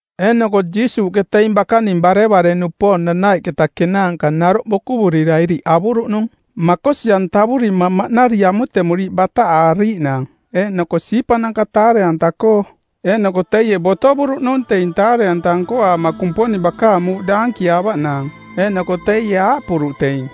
Eeꞌnoko Jiisuuꞌke teing bakaning barevare-nupoong nanaiꞌketa kenaanka naroꞌ bokuvurira iriꞌ avuruꞌnung makosi-antavurima maꞌnari amutemuriiꞌ bataꞌaariiꞌnaang eeꞌnoko siipananka taare-anta-koo. Eeꞌnoko teie botovuruꞌnung teing taare-anta nkoaama Kumponing bakaang muuꞌ daankiaavaꞌnaang. Eeꞌnoko teie aaꞌpuruꞌ teing,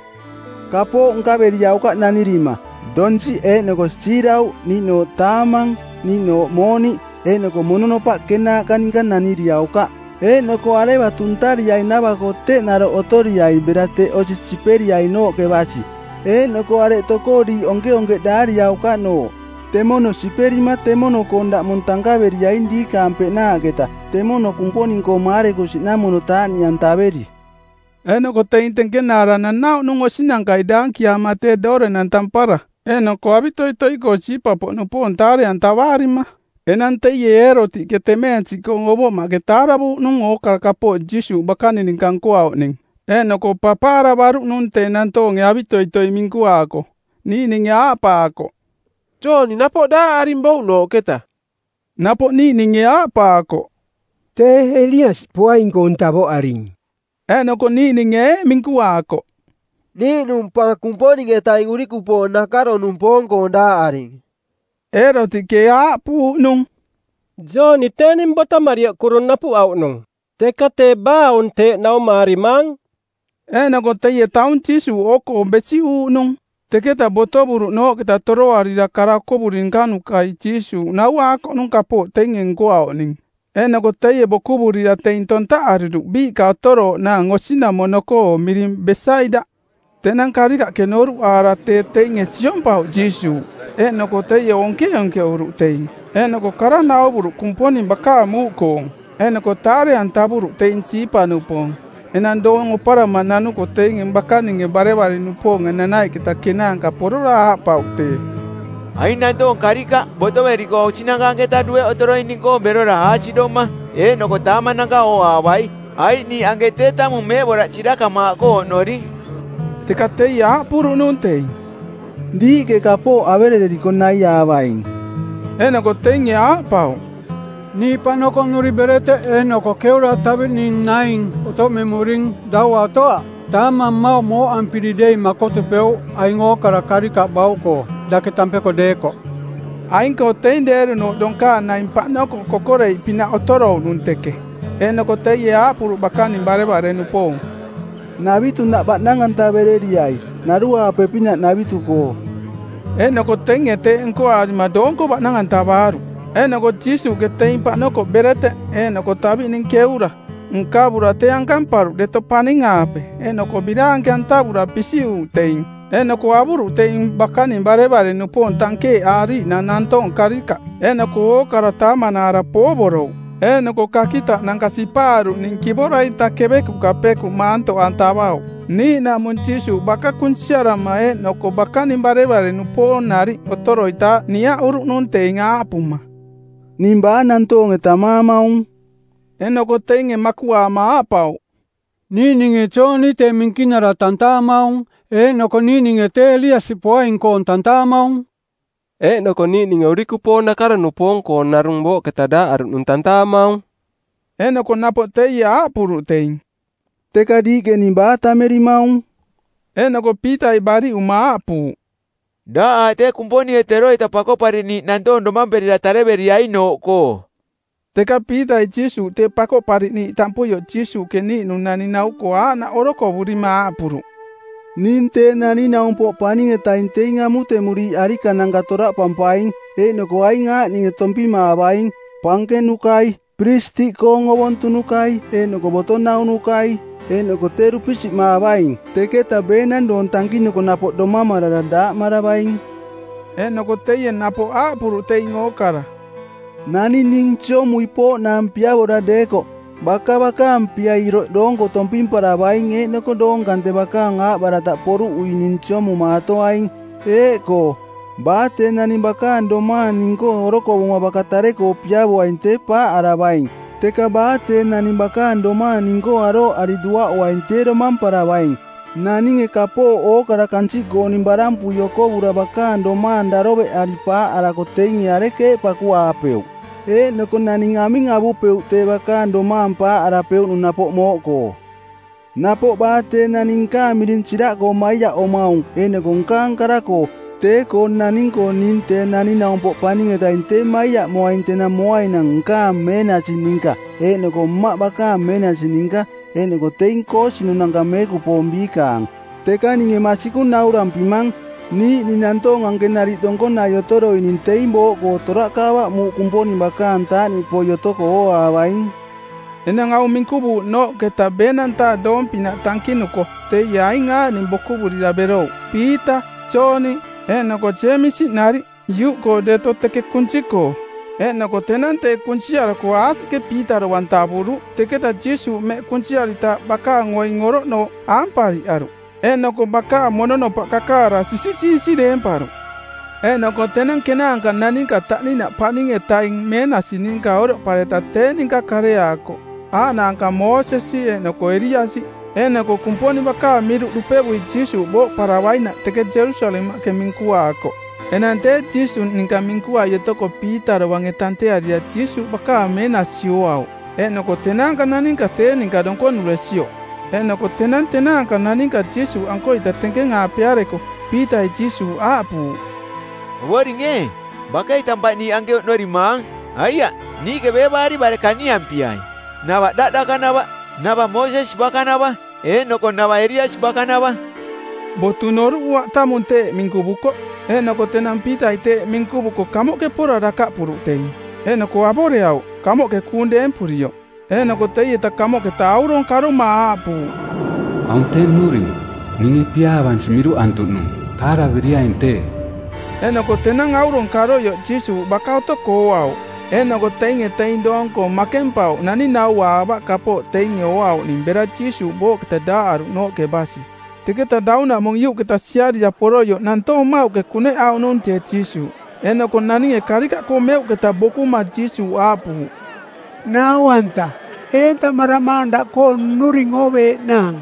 “Kapooꞌ nkaveriaukaꞌ nanirima: Donsiꞌ eeꞌnoko siirauꞌ niiꞌnooꞌ taamang niiꞌnooꞌ mooniꞌ. Eeꞌnoko mononopaꞌ kenaaꞌka ninka naniriaukaꞌ. Eeꞌnoko areva tuntariainava-koo teꞌ naroꞌ otoriai bera teꞌ osi siperiainooꞌke basi. Eeꞌnoko areꞌ tokoo diiꞌ onkeonkeꞌdaariaukaꞌnooꞌ temono siperima temono-koong daꞌmong tankaveriaing diikaang peꞌnaaꞌketa, temono Kumponing-koo maarekusiꞌnamono taaꞌniꞌantaveri.” Eeꞌnoko teing tenkenaara nanauꞌnung osinankai daankiaama tee doorenang tampara eeꞌnoko avitoitoi-koo siipa-poꞌnupoong taare-antavaarima. Enang teie Eerotiꞌke, temeensiꞌkoong ovoꞌmaꞌke taaravuuꞌnung ookara kapooꞌ Jiisuuꞌ bakaning ninka nkoauꞌning, eeꞌnoko papaaravaruꞌnung tee nantoonge avitoitoi minkuaako. Niiꞌninge aaꞌpaakoꞌ, “Jooni napoꞌ daaꞌaring bouꞌnooꞌketa.” Napoꞌ niiꞌninge aaꞌpaakoꞌ, “Tee Eliasi poaing-koong tavoꞌaring.” Eeꞌnoko niiꞌninge eeꞌ minkuaakoꞌ, “Niiꞌnung pa Kumponing-etaing urikupoong nakaro-nupoong-koo daaꞌaring.” Eerotiꞌke aaꞌpuuꞌnung, “Jooni tee ning botomarioꞌ kuru napuꞌauꞌnung. Teka tee baa aung teeꞌ naumaarimaang?” Eeꞌnoko teie taung Jiisuuꞌ oo-koong besiꞌuuꞌnung. Teketa botovuruꞌnooꞌketa toroarira kara okovuri nkanukai Jiisuuꞌ nauaakoꞌnung kapooꞌ teinge nkoauꞌning. Eeꞌnoko teie bokuvurira teing tontaꞌariruꞌ biiꞌka otorooꞌnaang osinamono-koo miring Besaida. Tenang karikaꞌke noruꞌaara tee teinge siompauꞌ Jiisuuꞌ, eeꞌnoko teie onkeonkeꞌuruꞌ teing, eeꞌnoko kara nauvuruꞌ Kumponing bakaang muuꞌkoong. Eeꞌnoko taare-antavuruꞌ teing siipa-nupoong. Enang doong oparama nanuko teing bakaning barevare-nupoong nanaiꞌketa kenaanka porora aaꞌpauꞌ tee, “Aing nantoong karikaꞌ botoveriko osinanka anketa dueꞌ otoroining-koo berora aasiꞌdoma eeꞌnoko taamananka ooaavai, aiꞌ niiꞌ anke tee tamung meeꞌboraꞌ sirakamaaꞌkoo oꞌnoring.” Teka teie aaꞌpuruꞌnung teing, “Diiꞌke kapooꞌ averereriko naiaavaing.” Eeꞌnoko teinge aaꞌpauꞌ, “Niiꞌ paꞌnokoꞌnuri bereteꞌ eeꞌnoko keura taviꞌning naing otoꞌmemuring, daua otoaꞌ. Taamang mmauꞌ mooꞌampiri dei makotupeuꞌ aing ookara karikaꞌ bauꞌkoo dake tampeko deekoꞌ.” Aing-koo teing deerunooꞌ donkaang naing paꞌnokoꞌ kokoreiꞌpinaꞌ otorouꞌnung teke. Eeꞌnoko teie aaꞌpuruꞌ bakaning barevare-nupoong, “Navitunaꞌ baꞌnang-antavereriai, naruaape-pinaꞌ navitu-koo.” Eeꞌnoko teinge teeꞌ nkoaarima doonko baꞌnang-antavaaruꞌ. Eeꞌnoko Jiisuuꞌke teing paꞌnokoꞌ bereteꞌ eeꞌnoko taviꞌning keura nkavura tee ankamparuꞌ deto paning-aape eeꞌnoko biraanke-antavura pisiꞌuruꞌ teing. Eeꞌnoko avuruꞌ teing bakaning barevare-nupoong tankeeꞌaariiꞌnaang nantoong karikaꞌ. Eeꞌnoko ookara taamanaara poovorouꞌ. Eeꞌnoko kakitaꞌnanka sipaaruꞌning kivora-ita kevekuꞌka pekuꞌ maantoꞌantavauꞌ. Niiꞌnaꞌmung Jiisuuꞌ baka kunsiarama eeꞌnoko bakaning barevare-nupoong nariꞌ otoroitaaꞌ niaꞌuruꞌnung teing aaꞌpuma, “Ning baa nantoonge tammaamaung?” Eeꞌnoko teinge makuꞌaama aaꞌpauꞌ, “Niiꞌninge Jooni tee minkinara tantaamaung, eeꞌnoko niiꞌninge tee Eliasi poaing-koong tantaamaung, eeꞌnoko niiꞌninge urikupoong nakaro-nupoong-koong narung booꞌketa daaꞌaruꞌnung tantaamaung.” Eeꞌnoko napoꞌ teie aaꞌpuruꞌ teing, “Teka diiꞌke ning baa tammerimaung?” Eeꞌnoko Piitai bariꞌuma aaꞌpuuꞌ, “Daꞌ aaꞌ tee Kumponinge teroita Pakoꞌpariꞌniiꞌ nantoong domamperira tareveriainooꞌkoo.” Teka Piitai Jiisuuꞌ tee Pakoꞌpariꞌniiꞌ tampuioꞌ Jiisuuꞌke niiꞌnung naning nau-koo aaꞌnaꞌ orokovurima aaꞌpuruꞌ, “Ning Tee Naning˜naumpoꞌ Paning-etaing teing amutemuriiꞌ arikananka toraꞌpampaing, eeꞌnoko aing aaꞌninge tompimaavaing: pankenukai, piristiꞌkoong ovontunukai eeꞌnoko boto naunukai, eeꞌnoko tee dupisiꞌmaavaing. Teketa beenang doong tankinuko napoꞌ domamarara daaꞌmaravaing.” Eeꞌnoko teie napoꞌ aaꞌpuruꞌ teing ookara, “Naning ning siomui pooꞌnaang piavora deekoꞌ, baka bakaang pia iroꞌ doonko tompimparavaing eeꞌnoko doong kante bakaang aaꞌbarataꞌ poruꞌui ning siomumaatoaing. Eeꞌkoo, baa tee naning bakaang domaang ning-koo orokovuma baka tare-koo piavoaing tee paaꞌaravaing, teka baa tee naning bakaang domaang ning-koo arooꞌari duaꞌuaing tee domamparavaing. Naninge kapooꞌ ookara kansiꞌkooning barampui okovura bakaang domaang daroveꞌari paaꞌarako teinge arekeeꞌ pakuaapeuꞌ? Eeꞌnoko naning aming avupeuꞌ tee bakaang domaang paaꞌaruꞌnung napoꞌ mooꞌkoo? Napoꞌ baa tee naning nkaang miring siraꞌkoo maiaꞌomaung eeꞌnoko nkaang kara-koo, tee-koo naning-koo ning Tee Naning-naumpoꞌ Paning-etaing tee maiaꞌmoaing tenang moainang nkaang meenasi ninka eeꞌnoko Mmaꞌ bakaang meenasi ninka eeꞌnoko teing koosinunanka meekupoong biikaang. Teka ninge masikung naurampimang, niiꞌning nantoong anke nariꞌ donkonai otoroining teing booꞌkoo toraꞌkaavaꞌ muuꞌ Kumponing bakaang taaꞌniꞌpoi otoko ooaavaing.” Enang aung minkuvuuꞌnooꞌketa ˜beenang-taa doong-pinaꞌ tankinuko teie aing aaꞌning bokuvurira berouꞌ: Piita, Jooni, eeꞌnoko Jeemisi nariꞌ, iuꞌkoo deto teke kunsi-koo. Eeꞌnoko tenang tee kunsiarako aasiꞌke Piita dovang tavuruꞌ. Teketa Jiisuuꞌ mmeꞌ kunsiaritaaꞌ bakaang oing oroꞌnooꞌ aampariꞌaruꞌ eeꞌnoko bakaang mononopaꞌ kakaara sisisiisi deemparuꞌ. Eeꞌnoko tenang kenaanka naninka taꞌninaꞌ paning-etaing meenasi ninka oroꞌpareta tee ninka kareaakoꞌ aaꞌnaanka Moosesi eeꞌnoko Eliasi. Eeꞌnoko Kumponing bakaang miruꞌ dupevui Jiisuuꞌ booꞌparavainaꞌ teke Jerusalemaꞌke minkuaakoꞌ. Enang tee Jiisuuꞌ ninka minkuai otoko Piita dovange tantearira Jiisuuꞌ bakaang meenasi ooauꞌ eeꞌnoko tenaanka naninka tee ninka donkonuresioꞌ. Eeꞌnoko tenang tenaanka naninka Jiisuuꞌankoita tenkeng-aapeareko Piitai Jiisuuꞌ aaꞌpuuꞌ, “Ovoring ee, bakei tampaꞌ niiꞌ anke oꞌnorimaang. Aiaꞌ niiꞌke beevaari bare kaniampiai, nava daꞌ dakanava, nava Moosesi bakanava eeꞌnoko nava Eliasi bakanava.” Botu noruꞌuaꞌ, tamung teeꞌ minkuvukoꞌ. Eeꞌnoko tenang Piitai teeꞌ minkuvuko kamoꞌke pora dakaꞌpuruꞌ teing, eeꞌnoko avoreauꞌ kaꞌmoꞌke kuung deempurioꞌ. Eeꞌnoko teieta kamoꞌketa auronge karoma aaꞌpuuꞌ, “Aung tee nnuring, ninge piaavansi miruꞌantuꞌnung. Taaraveriaing tee.” Eeꞌnoko tenang aurong karoioꞌ Jiisuuꞌ baka otoko ooauꞌ. Eeꞌnoko teinge teing doong-koo makempauꞌ naning nauaavaꞌ kapooꞌ teinge ooauꞌning bera Jiisuuꞌ booꞌketa daaꞌaruꞌnooꞌke basi. Teketa daunaꞌmung iuꞌketa siarira poroioꞌ nantoong mmauꞌke kuneꞌauꞌnung tee Jiisuuꞌ. Eeꞌnoko naninge karikaꞌkoo meuꞌketa bokuma Jiisuuꞌ aaꞌpuuꞌ, “Nau-anta, eentamaramaang daꞌkoo nnuring ooveeꞌnaang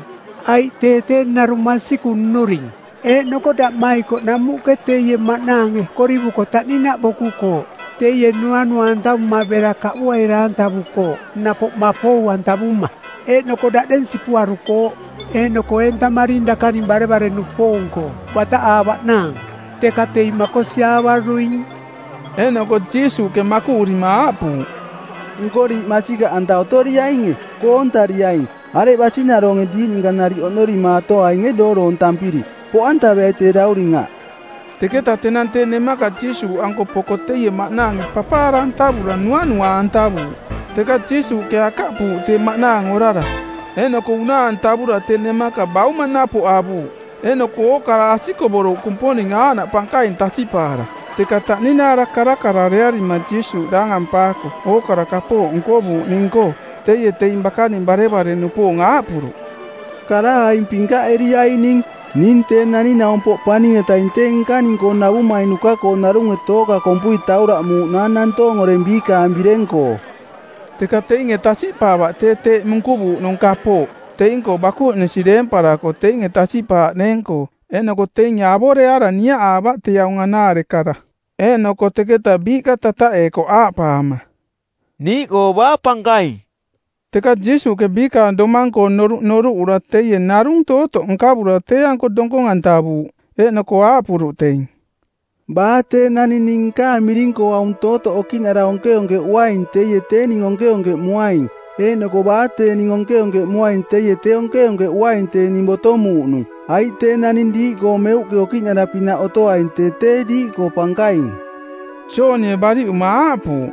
aiꞌ tee tee narung masikung nnuring. Eeꞌnoko daꞌmaikoꞌ namuꞌke teie maꞌnaange korivuko taꞌninaꞌ bokukooꞌ. Teie nuanua-antavuma bera kaꞌbuaira-antavukooꞌ napoꞌ mapou-antavuma˜, eeꞌnoko daꞌdeng sipuarukooꞌ. Eeꞌnoko eentamaring dakaning barevare-nupoong-koo bataꞌaavaꞌnaang, teka teing makosiaavaruing.” Eeꞌnoko Jiisuuꞌke makuꞌurima aaꞌpuuꞌ, “Nko diiꞌ masikaꞌanta otoriainge, koontariaing, areꞌ basinaroonge diiꞌ ninka nariꞌ oꞌnorimaatoainge dooroontampiri? Poꞌantaveai tee dauring aꞌ.” Teketa tenang tee nemaka Jiisuuꞌanko poko teie maꞌnaange papaara-antavura nuanua-antavuuꞌ. Teka Jiisuuꞌke akaꞌpuuꞌ tee maꞌnaang orara, eeꞌnoko unaa-antavura tee nemaka bauma napoꞌ avuuꞌ. Eeꞌnoko ookara asikovuruꞌ Kumponing aaꞌnaꞌ pankaing tasiꞌpaara. Teka taꞌninaara karakaraarearima Jiisuuꞌ daangampaako ookara kapooꞌ nkovuuꞌning-koo teie teing bakaning barevare-nupoong aaꞌpuruꞌ, “Kara aing pinkaꞌeriaining: Ning Tee Naning-naumpoꞌ Paning-etaing tee nkaning-koo navumainuka-koo narunge tooka kompui tauraꞌmuuꞌnaang nantoong oreng biikaang bireng-koo.” Teka teinge tasiꞌpaavaꞌ tee teeꞌ minkuvuuꞌnung kapooꞌ teing-koo bakuꞌnisi deemparako teinge tasiꞌpaaꞌneeng-koo, eeꞌnoko teinge avoreaara niaꞌaavaꞌ tee aung anaare kara. Eeꞌnoko teketa biiꞌka tataꞌeekoꞌ aaꞌpaama, “Niiꞌkoo baa pankaing?” Teka Jiisuuꞌke biikaang domang-koong noruꞌ noruꞌura teie narung tootoꞌ nkavura tee-anko donkong-antavuuꞌ. Eeꞌnoko aaꞌpuruꞌ teing, “Baa tee naning ning nkaang miring-koo aung tootoꞌ okiꞌnara onkeonkeꞌuaing teie tee ning onkeonkeꞌmuaing, eeꞌnoko baa tee ning onkeonkeꞌmuaing teie tee onkeonkeꞌuaing tee ning botomuuꞌnung, aiꞌ tee naning diiꞌkoo meuꞌke okiꞌnara-pinaꞌ otoaing tee tee diiꞌkoo pankaing.” Joonie bariꞌuma aaꞌpuuꞌ,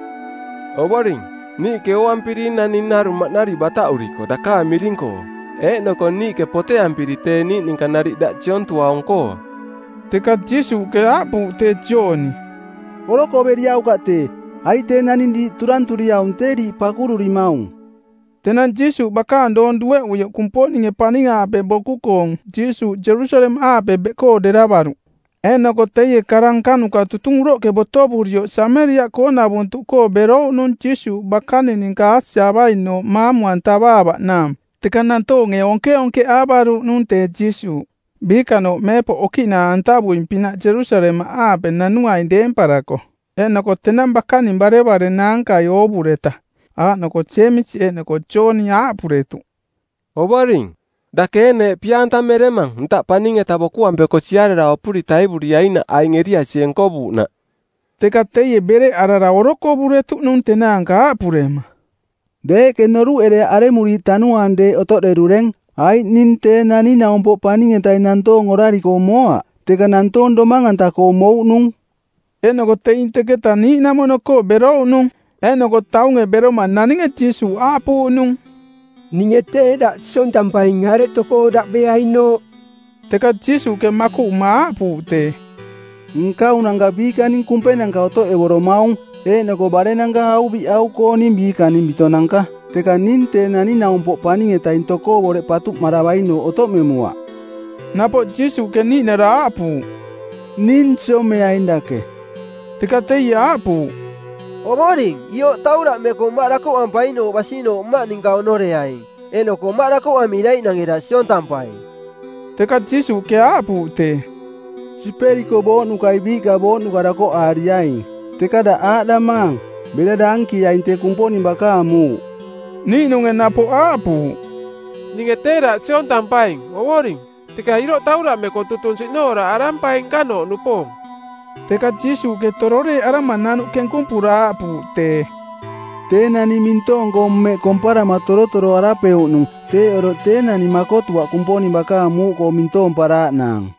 “Ovoring, niiꞌke ooampiring naning narung maꞌnari bataꞌuriko dakaang miring-koo eeꞌnoko niiꞌke poteampiri tee niiꞌ ninka nariꞌ daꞌ siontuaung-koo.” Teka Jiisuuꞌke aaꞌpuuꞌ tee Jooni, “Orokoveriaukaꞌ tee, aiꞌ tee naning diiꞌ turanturiaung tee diiꞌ pakururimaung.” Tenang Jiisuuꞌ bakaang doong dueꞌuioꞌ Kumponinge paning-aape boku-koong Jiisuuꞌ Jerusalemaꞌaape beꞌkoo deravaruꞌ. Eeꞌnoko teie kara nkanuka tutung uroꞌke botovurioꞌ Sameriaꞌkoonavuntuꞌkoo berouꞌnung Jiisuuꞌ bakaning ninka aasiaavainooꞌ maamu-antavaavaꞌnaang. Teka nantoonge onkeonkeꞌaavaruuꞌnung tee Jiisuuꞌ, biikanooꞌ meepoꞌ okiꞌnaa-antavuing-pinaꞌ Jerusalemaꞌaape nanuaing deemparako. Eeꞌnoko tenang bakaning barevare-naankai oovureta, aaꞌnoko Jeemisi eeꞌnoko Jooni, aaꞌpuretuꞌ, “Ovoring, dake ee neeꞌ pia-antameremang ntaꞌ paning-eta bokuampeko siarara opuri taivuriainaꞌ aing Eliasie nkovuuꞌna?” Teka teie bereꞌarara orokovuretuꞌnung tenaanka aaꞌpurema, “Deeꞌke noruꞌereaꞌ aremuriiꞌ tanuaang deeꞌ otoꞌderureng, aiꞌ ning Tee Naning-naumpoꞌ Paning-etaing nantoong orari-koo moaꞌ, teka nantoong domang-anta-koo mouꞌnung.” Eeꞌnoko teing teketa niiꞌnamono-koo berouꞌnung. Eeꞌnoko taunge beroma naninge Jiisuuꞌ aaꞌpuuꞌnung, “Ninge tee daꞌ siontampaing areꞌ tokoo daꞌ beainooꞌ.” Teka Jiisuuꞌke makuꞌuma aaꞌpuuꞌ tee, “Nkaunanka biikaning kumpenanka otoꞌevoromaung, eeꞌnoko barennanka auviꞌau-kooning biikaning bitonanka, teka ning tee Naning-naumpoꞌ Paning-etaing tokoo boreꞌ patuꞌmaravainooꞌ otoꞌmemuaꞌ.” Napoꞌ Jiisuuꞌke niiꞌnara aaꞌpuuꞌ, “Ning siomeaing dake.” Teka teie aaꞌpuuꞌ, “Ovoring, ioꞌ tauraꞌmeko mmaꞌ dakoꞌampainooꞌ basinooꞌ mmaꞌ ninka oꞌnoreaing, eeꞌnoko mmaꞌ dakoꞌamiraiꞌnange daꞌ siontampai.” Teka Jiisuuꞌke aaꞌpuuꞌ tee, “Siperiko booꞌnukai biiꞌka booꞌnuka dakoꞌaariaing, teka daꞌ aaꞌdamaang: Bera daankieaing tee Kumponing bakaang muuꞌ.” Niiꞌnunge napoꞌ aaꞌpuuꞌ, “Ninge tee daꞌ siontampaing, Ovoring, teka iroꞌ tauraꞌmeko tutung siꞌnooraꞌarampaing nkanooꞌnupoong.” Teka Jiisuuꞌke tororeeꞌarama-nanuꞌ kenkumpura aaꞌpuuꞌ tee, “Tee naning mintoong-koo mmeꞌ komparama torotoroarapeuꞌnung teeꞌ oroꞌ tee, naning makotuaꞌ Kumponing bakaang muuꞌkoo mintoomparaaꞌnaang.”